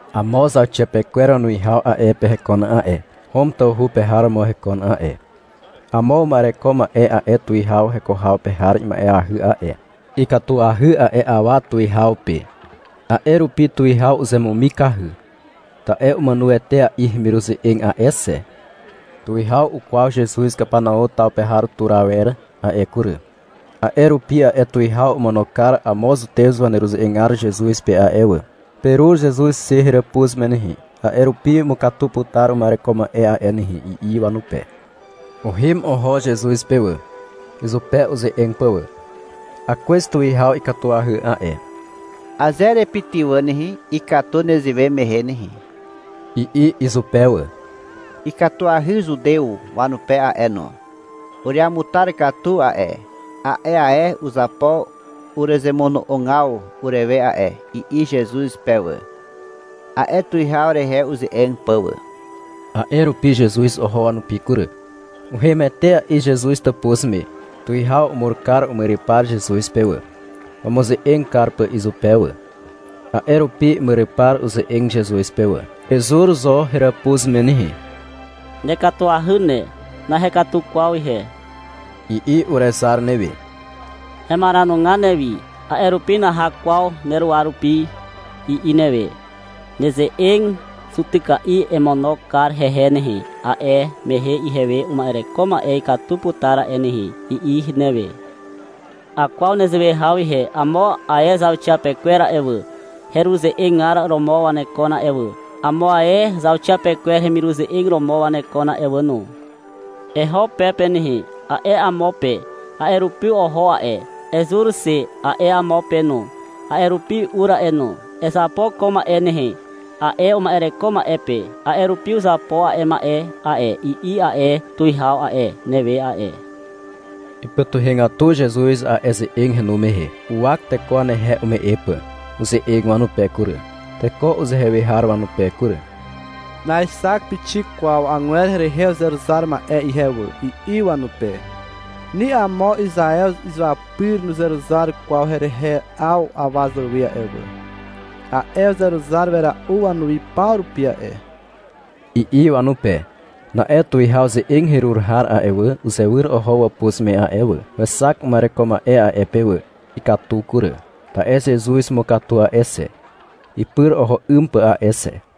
Amo zauxiapekwer wanuwihaw a'e pe hekon a'e, Hom tawhu pe har romo hekon a'e. Amo uma'ereko ma'e a'e tuwihaw heko haw pe har ima'eahy a'e. Ikatuahy a'e awa tuwihaw pe, a'e rupi tuwihaw uzemumikahy. Ta'e umàno etea'i hemiruze'eg a'e xe. Tuwihaw ukwaw Zezuz Kapanau taw pe tur awer a'e kury. A'e rupi a'e tuwihaw omono kar amo zutew waneruze'egar Zezuz pe a'e wà. — Perur Zezuz xe heràpuz me nehe, a'e rupi umukatu putar uma'ereko ma'e a'e nehe, i'i wanupe. Uhem oho Zezuz pe wà, izupe uze'eg pà wà. — Akwez tuwihaw ikatuahy a'e. Aze erepytywà nehe, ikatu nezewe mehe nehe, i'i izupe wà. — Ikatuahy Zutew wanupe a'e no. Ureamutar katu a'e. A'e ae uzapo urezemono'ogaw urewe a'e, i'i Zezuz pe wà, a'e tuwihaw rehe uze'eg pà wà. A'e rupi Zezuz oho wanupi kury. Uhem etea'i Zezuz tàpuz me. Tuwihaw umur kar umyrypar Zezuz pe wà, wamuze'eg kar pà izupe wà. A'e rupi imyrypar uze'eg Zezuz pe wà. — Ezur zo heràpuz me nehe. Nekatuahy ne, nahekatu kwaw ihe, i'i urezar newe. — Hemaranugar newi, a'e rupi naha kwaw neruwa rupi, i'i newe. — Neze'eg zutyka'i emono kar hehe nehe, a'e mehe ihewe uma'ereko ma'e ikatu putar a'e nehe, i'i newe. Akwaw nezewe haw ihe, amo ae zauxiapekwer a'e wà, hereruze'egar romo wanekon a'e wà. Amo ae zauxiapekwer heremiruze'eg romo wanekon a'e wà no. — Eho pe pe nehe, a'e amo pe. A'e rupi oho a'e. — Ezur xe, a'e amo pe no. A'e rupi ur a'e no. — Ezapo ko ma'e nehe, a'e uma'ereko ma'e pe. A'e rupi uzapo a'e ma'e a'e, i'i a'e tuwihaw a'e, newe a'e. Ipytuhegatu Zezuz a'e ze'eg henu mehe. Uwak teko wanehe ume'e pà. Uze'eg wanupe kury, teko uzehe we har wanupe kury. — Naexak pixik kwaw agwer herehe uzeruzar ma'e ihe wà, i'i wanupe. — Ni amo Izaew izuapyr nuzeruzar kwaw herehe 'aw awa zàwe a'e wà. A'e uzeruzar wera'u wanuwi paw rupi a'e, i'i wanupe. Na'e tuwihaw ze'eg herur har a'e wà, uzewyr oho wàpuz me a'e wà. Wexak uma'ereko ma'e a'e pe wà. Ikatu kury, (ta'e Zezuz umukatu a'e xe, ipyr oho 'ym pà a'e xe).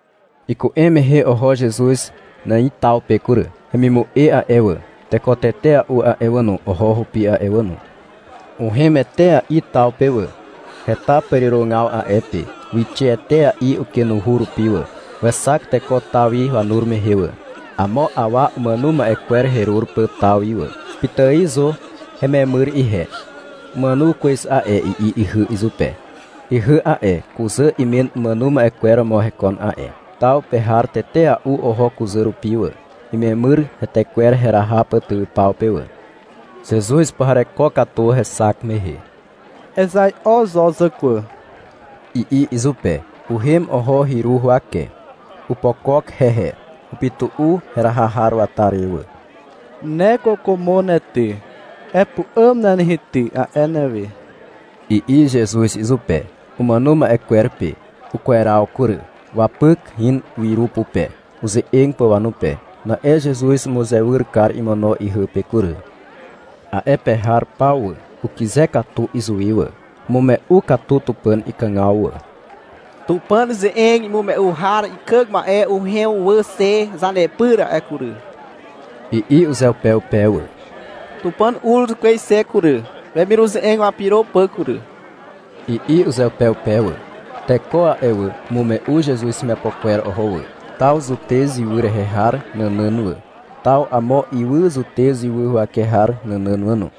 Iku'em mehe oho Zezuz Nài taw pe kury. Hemimu'e a'e wà, teko tetea'u a'e wà no, oho hupi a'e wà no. Uhem etea'i taw pe wà. Heta pàrirogaw a'e pe. Wixe etea'i ukenuhu rupi wà. Wexak teko taw wi wanur mehe wà, amo awa umàno ma'e kwer herur pà taw wi wà. — Pitài zo hememyr ihe. Umàno kwez a'e, i'i ihy izupe. Ihy a'e, kuzà imen umàno ma'e kwer romo hekon a'e. Taw pe har tetea'u oho kuzà rupi wà, imemyr hetekwer heraha pà tywypaw pe wà. Zezuz upuhareko katu hexak mehe. — Ezai'o zo, zàkwà, i'i izupe. Uhem oho hyru huwake. Opokok hehe. Upytu'u heraha har wata re wà. — Ne kwàkwàmo ne ty, epu'àm ne nehe ty, a'e newe, i'i Zezuz izupe, umàno ma'e kwer pe. Ukweraw kury. Wapyk in wyru pupe, uze'eg pà wanupe. Na'e Zezuz umuzewyr kar imono ihy pe kury. A'e pe har paw wà, ukyze katu izuwi wà. Umume'u katu Tupàn ikàgaw wà. — Tupàn ze'eg imume'u har ikàg ma'e uhem wà xe zanepyr a'e kury, i'i uzeupeupe wà. — Tupàn ur kwez xe kury, wemiruze'eg wapyro pà kury, i'i uzeupeupe wà. Teko a'e wà, umume'u Zezuz hemiapo kwer oho wà, taw Zutez ywy rehe har nànàn wà, taw amo ywy Zutez ywy huwake har nànàn wà no.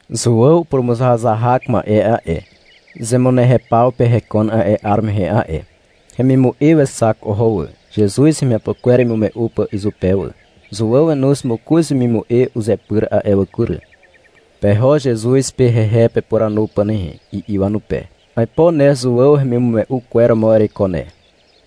Zuàw purumuzahazahak ma'e a'e, zemunehew paw pe hekon a'e 'ar mehe a'e. Hemimu'e wexak oho wà, Zezuz hemiapo kwer imume'u pà izupe wà. Zuàw wenoz mokoz wemimu'e uzepyr a'e wà kury. — Peho Zezuz pe hehe pepuranu pà nehe, i'i wanupe. — Aipo ne Zuàw hemimume'u kwer romo ereiko ne,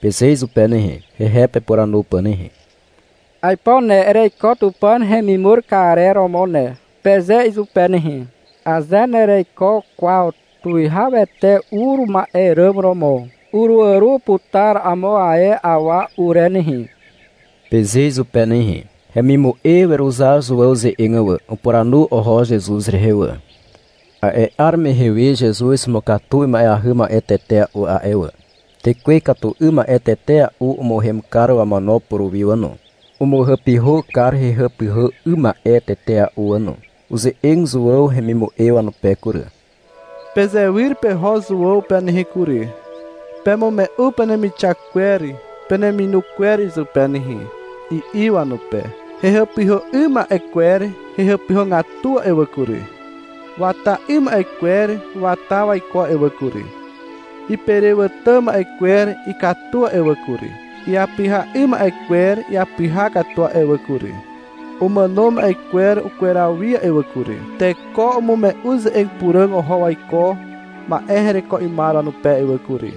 peze izupe nehe, hehe pepuranu pà nehe. — Aipo ne ereiko Tupàn hemimur karer romo ne, peze izupe nehe. — Aze nereiko kwaw Tuwihawete ur ma'e ràm romo, uruàro putar amo ae awa ure nehe, peze izupe nehe. Hemimu'e weruzar Zuàw ze'eg wà, upuranu oho Zezuz rehe wà. A'e 'ar mehe we Zezuz umukatu ima'eahy ma'e tetea'u a'e wà. Tekwe ikatu 'ym ma'e tetea'u umuhem kar wamono puruwi wà no. Umuhàpyhà kar hehàpyhà 'ym ma'e tetea'u wà no. Uze'eg Zuàw hemimu'e wanupe kury. — Pezewyr peho Zuàw pe nehe kury. Pemume'u penemixak kwer peneminu kwer izupe nehe, i'i wanupe. — Hehàpyhà 'ym ma'e kwer hehàpyhàgatu a'e wà kury. Wata 'ym ma'e kwer wata waiko a'e wà kury. Iperewàtà ma'e kwer ikatu a'e wà kury. Iapyha 'ym ma'e kwer iapyha katu a'e wà kury. Umàno ma'e kwer ukweraw wi a'e wà kury. Teko umume'u ze'eg puràg oho waiko ma'e hereko 'ymar wanupe a'e wà kury,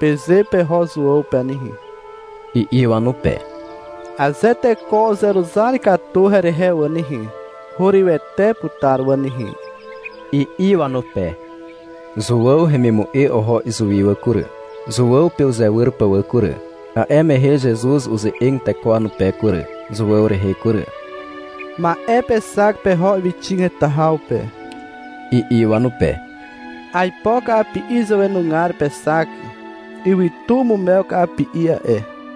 peze peho Zuàw pe nehe, i'i wanupe. Aze teko uzeruzar katu herehe wà nehe, hurywete putar wà nehe, i'i wanupe. Zuàw hemimu'e oho izuwi wà kury, Zuàw pe uzewyr pà wà kury. A'e mehe Zezuz uze'eg teko wanupe kury, Zuàw rehe kury. — Ma'e pexak peho ywyxig heta haw pe, i'i wanupe. — Aipo ka'api'i zàwenugar pexak. Ywytu umumew ka'api'i a'e.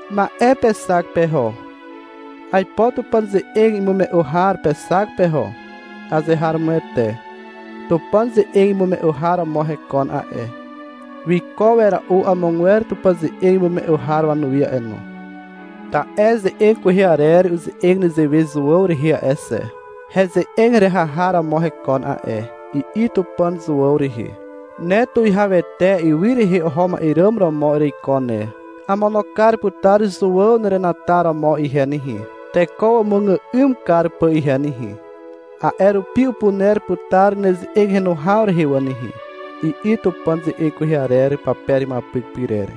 Ma'e pexak peho. Aipo Tupàn ze'eg imume'u har pexak peho. Azeharomoete. Tupàn ze'eg imume'u har romo hekon a'e. Wiko wera'u amogwer Tupàn ze'eg imume'u har wanuwi a'e no. Ta'e ze'eg kwehe arer uze'eg nezewe Zuàw rehe a'e xe. — Heze'eg heraha har romo hekon a'e, i'i Tupàn Zuàw rehe. Ne tuwihawete ywy rehe oho ma'e ràm romo ereiko ne. Amono kar putar Zuàw nerenataromo ihe nehe, teko wamuàgà'ym kar pà ihe nehe. A'e rupi upuner putar neze'eg henu haw rehe wà nehe, i'i Tupàn ze'eg kwehe arer pape rehe imuapyk pyrer.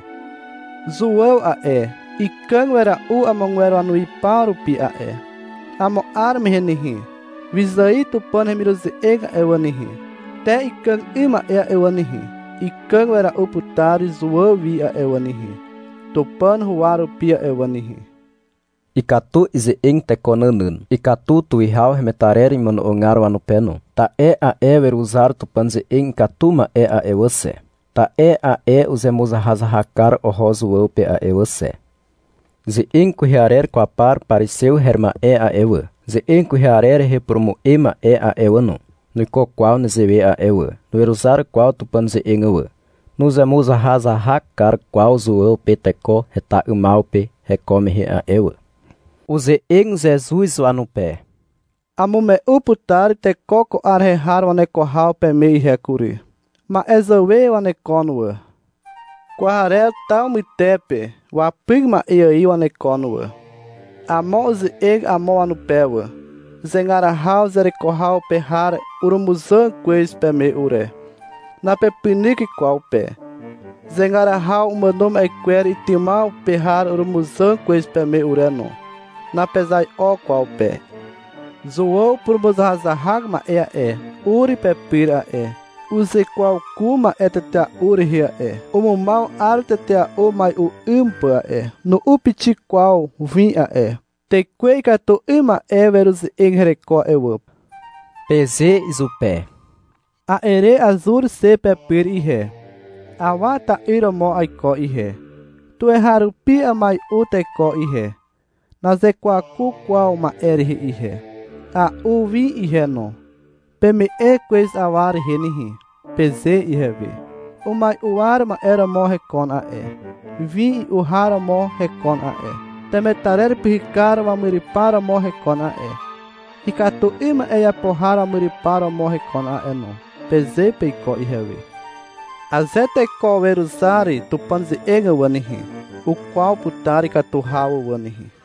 Zuàw a'e, ikàg wera'u amogwer wanuwi paw rupi a'e. Amo 'ar mehe nehe, wyzài Tupàn hemiruze'eg a'e wà nehe, te ikàg 'ym ma'e a'e wà nehe, ikàg wera'u putar Zuàw wi a'e wà nehe, Tupàn huwa rupi a'e wà nehe. Ikatu ize'eg teko nànàn. Ikatu tuwihaw hemetarer imono'ogar wanupe no. Ta'e a'e weruzar Tupàn ze'eg ikatu ma'e a'e wà xe, ta'e a'e uzemuzahazahak kar oho Zuàw pe a'e wà xe. Ze'eg kwehe arer kwaw par parizew her ma'e a'e wà, ze'eg kwehe arer rehe upurumu'e ma'e a'e wà no, nuiko kwaw nezewe a'e wà. Nuweruzar kwaw Tupàn ze'eg wà, nuzemuzahazahak kar kwaw Zuàw pe teko heta 'ymaw pe heko mehe a'e wà. Uze'eg Zezuz wanupe. Amume'u putar teko ko 'ar rehe har waneko haw peme ihe kury. Ma'e zàwe wanekon wà. Kwarer taw mytepe wapyk ma'e ài wanekon wà. Amo uze'eg amo wanupe wà. — Zegar haw zereko haw pe har urumuzàg kwez peme ure, napepynyk kwaw pe. Zegar haw umàno ma'e kwer itymaw pe har urumuzàg kwez peme ure no, napezai'o kwaw pe, i'i wanupe wà. Zuàw purumuzahazahak ma'e a'e, ur pepyr a'e, uzekwaku ma'e tetea'u rehe a'e. Umumaw 'ar tetea'u umai'u 'ym pà a'e. Nu'u pixik kwaw win a'e. Tekwe ikatu 'ym ma'e weruze'eg hereko a'e wà, peze izupe. A'e re azur xe pepyr ihe. Awa ta'yr romo aiko ihe. Tuweharupi amai'u teko ihe. Nazekwaku kwaw ma'e rehe ihe. A'u win ihe no. — Peme'e kwez awa rehe nehe, peze ihewe. Umai'u war ma'e romo hekon a'e, win i'u har romo hekon a'e, temetarer pyhykar wamyrypar romo hekon a'e, ikatu 'ym ma'e iapo har wamyrypar romo hekon a'e no, peze peiko ihewe. Aze teko weruzar Tupàn ze'eg wà nehe, ukwaw putar ikatu haw wà nehe.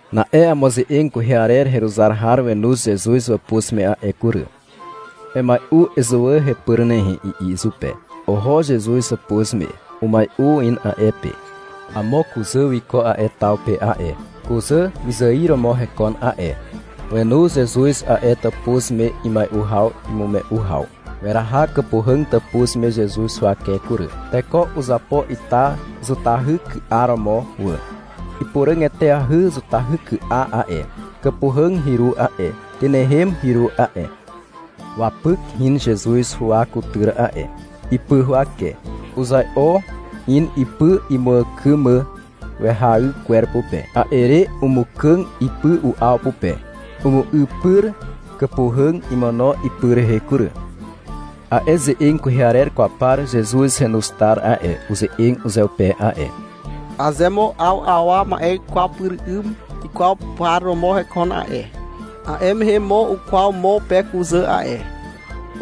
Na'e amo ze'eg kwehe arer heruzar har wenoz Zezuz wàpuz me a'e kury. — Emai'u ezuwà hepyr nehe, i'i izupe. Oho Zezuz hàpuz me. Umai'u in a'e pe. Amo kuzà wiko a'e taw pe a'e. Kuzà wyzài romo hekon a'e. Wenu Zezuz a'e tàpuz me imai'u haw imume'u haw. Weraha kàpuhàg tàpuz me Zezuz huwake kury. (Teko uzapo ita zutahyky'a romo wà.) Ipuràg eteahy zutahyky'a a'e, kàpuhàg hyru a'e. Tynehem hyru a'e. Wapyk in Zezuz huwa kutyr a'e, ipy huwake. Uzai'o in ipy imuàkym mà wehay kwer pupe, a'e re umukàg ipy u'aw pupe. Umu'ypyr kàpuhàg imono ipy rehe kury. A'e ze'eg kwehe arer kwaw par Zezuz henoz tar a'e, uze'eg uzeupe a'e. — Aze mo 'aw awa ma'e ikwaw pyr 'ym ikwaw par romo hekon a'e, a'e mehe mo ukwaw mo pe kuzà a'e,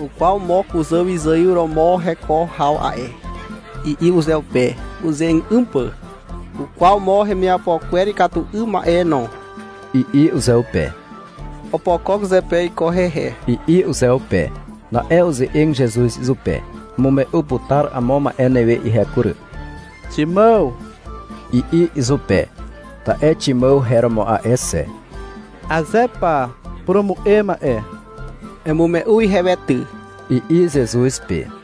ukwaw mo kuzà wyzài romo heko haw a'e, i'i uzeupe, uze'eg 'ym pà. — Ukwaw mo hemiapo kwer ikatu 'ym ma'e no, i'i uzeupe. — Opokok zepe iko hehe, i'i uzeupe. Na'e uze'eg Zezuz izupe. — Amume'u putar amo ma'e newe ihe kury, Ximàw, i'i izupe (ta'e Ximàw her romo a'e xe.) — Aze pa, purumu'e ma'e. Emume'u ihewe ty, i'i Zezuz pe.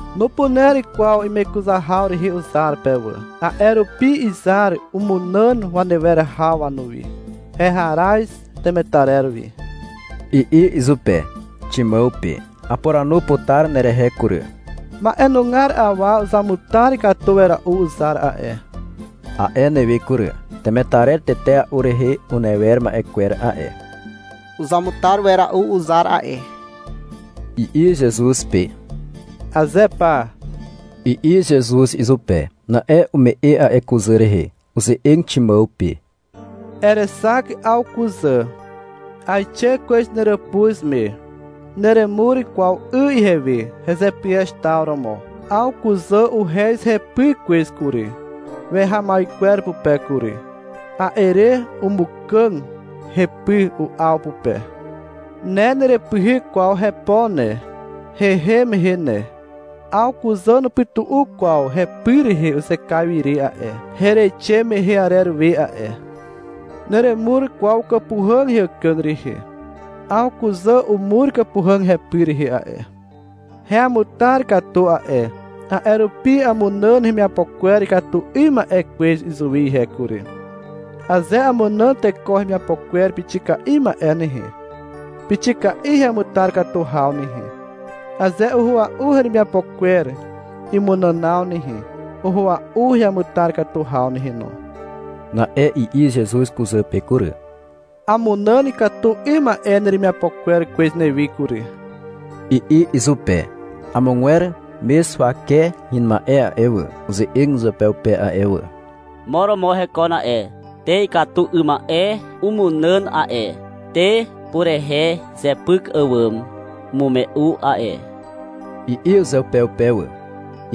Nupuner kwaw imekuzar haw rehe uzar pe wà. A'e rupi izar umunàn wanewer haw wanuwi. Heharaz temetarer wi, i'i izupe, Ximàw pe. Apuranu putar nerehe kury. — Ma'enugar awa uzamutar katu wera'u uzar a'e, a'e newe kury. — Temetarer tetea'u rehe unewer ma'e kwer a'e. Uzamutar wera'u uzar a'e, i'i Zezuz pe. — Aze pa, i'i Zezuz izupe. Na'e ume'e a'e kuzà rehe. Uze'eg Ximàw pe. — Erexak 'aw kuzà. Aixe kwez neràpuz me, neremur kwaw 'y ihewe hezepyez taw romo. 'Aw kuzà uhez hepy kwez kury, wehay kwer pupe kury. A'e re umukàg hepy u'aw pupe. Ne nerepyhyk kwaw hepo ne, hehem mehe ne. 'Aw kuzà nupytu'u kwaw hepy rehe uzekaiw ire a'e, hereixe mehe arer we a'e. Neremur kwaw kàpuhàg heàkàg rehe. 'Aw kuzà umur kàpuhàg hepy rehe a'e. Heamutar katu a'e, a'e rupi amunàn hemiapo kwer ikatu 'ym ma'e kwez izuwi ihe kury. Aze amunàn teko hemiapo kwer pixika'i ma'e nehe, pixika'i heamutar katu haw nehe. Aze uhua'u hemiapo kwer imunànaw nehe, uhua'u heamutar katu haw nehe no. Na'e i'i Zezuz kuzà pe kury. Amunàn ikatu 'ym ma'e neremiapo kwer kwez newi kury, i'i izupe. Amogwer mez huwake hin ma'e a'e wà, uze'eg uzeupeupe a'e wà. — Mo romo hekon a'e, te ikatu 'ym ma'e umunàn a'e, te purehe zepyk àwàm umume'u a'e, i'i uzeupeupe wà.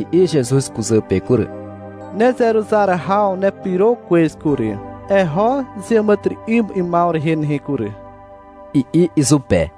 I'i Zezuz kuzà pe kury. — Nezeruzar haw nepyro kwez kury. Eho zeàmàtyry'ym 'ymaw rehe nehe kury, i'i izupe.